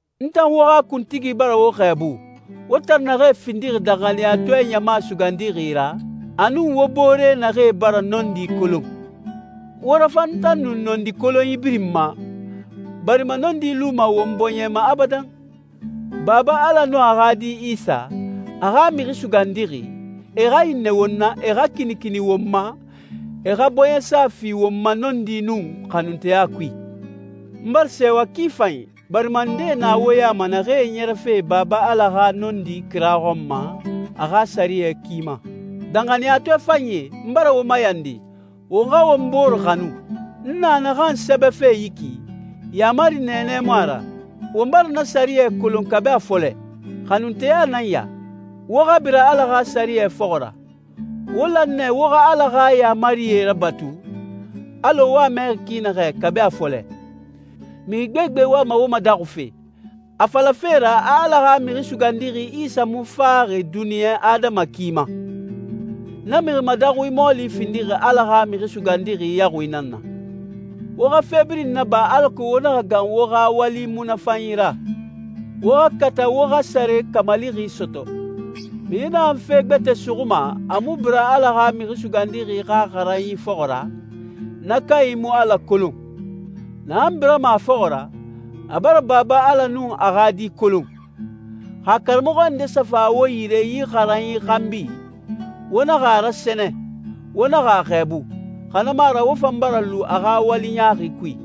N tan wo xa kuntigi bara wo xɛɛbu, wo tan naxee findixi danxaniyatɔɛ ɲama sugandixi ra, a nun wo boore naxee bara nɔndi kolon. Wo rafan n tan nun nɔndi kolonyi birin ma, barima nɔndi luma won bɔɲɛ ma abadan. Baba Ala nun a xa Di Isa, a xa Mixi Sugandixi, e xa hinnɛ won na, e xa kinikini won ma, e xa bɔɲɛsa fi won ma nɔndi nun xanunteya kui. N bara sɛɛwa ki fanyi, barima ndee na wo ya ma naxee ɲɛrɛfe Baba Ala xa nɔndi kira xɔn ma a xa sɛriyɛ ki ma. Danxaniyatɔɛ fanyie, n bara wo mayandi, won xa won bore xanu. N na naxan sɛbɛfe yi ki, yaamari nɛɛnɛ mu a ra. Won bara na sɛriyɛ kolon kabi a fɔlɛ. Xanunteya nan ya, wo xa bira Ala xa sɛriyɛ fɔxɔ ra. Wo lan nɛ wo xa Ala xa yaamarie rabatu, alɔ wo a mɛxi ki naxɛ kabi a fɔlɛ. Mixi gbegbe wama wo madaxufe, a falafe ra a Ala xa Mixi Sugandixi Isa mu faxi duniɲa adama ki ma. Na mixi madaxui mɔɔli findixi Ala xa Mixi Sugandixi yaxui nan na. Wo xa fe birin naba alako wo naxa gan wo xa wali munafanyi ra. Wo xa kata wo xa sare kamalixi sɔtɔ. Mixi naxan fe gbɛtɛ suxuma, a mu bira Ala xa Mixi Sugandixi xa xaranyi fɔxɔ ra, na kanyi mu Ala kolon. Naxan birama a fɔxɔ ra, a bara Baba Ala nun a xa Di kolon. Xa karamɔxɔ nde sa fa wo yire yi xaranyi xanbi, wo naxa a rasɛnɛ, wo naxa a xɛɛbu, xa na mu a ra wo fan bara lu a xa wali ɲaaxi kui.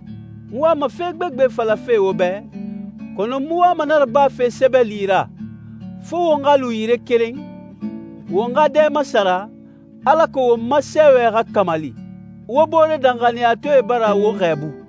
N wama fe gbegbe falafe wo bɛ, kɔnɔ n mu wama na rabafe sɛbɛli ra, fo won xa lu yire keren, won xa dɛ masara, alako won ma sɛɛwɛ xa kamali. Wo boore danxaniyatɔɛe bara wo xɛɛbu.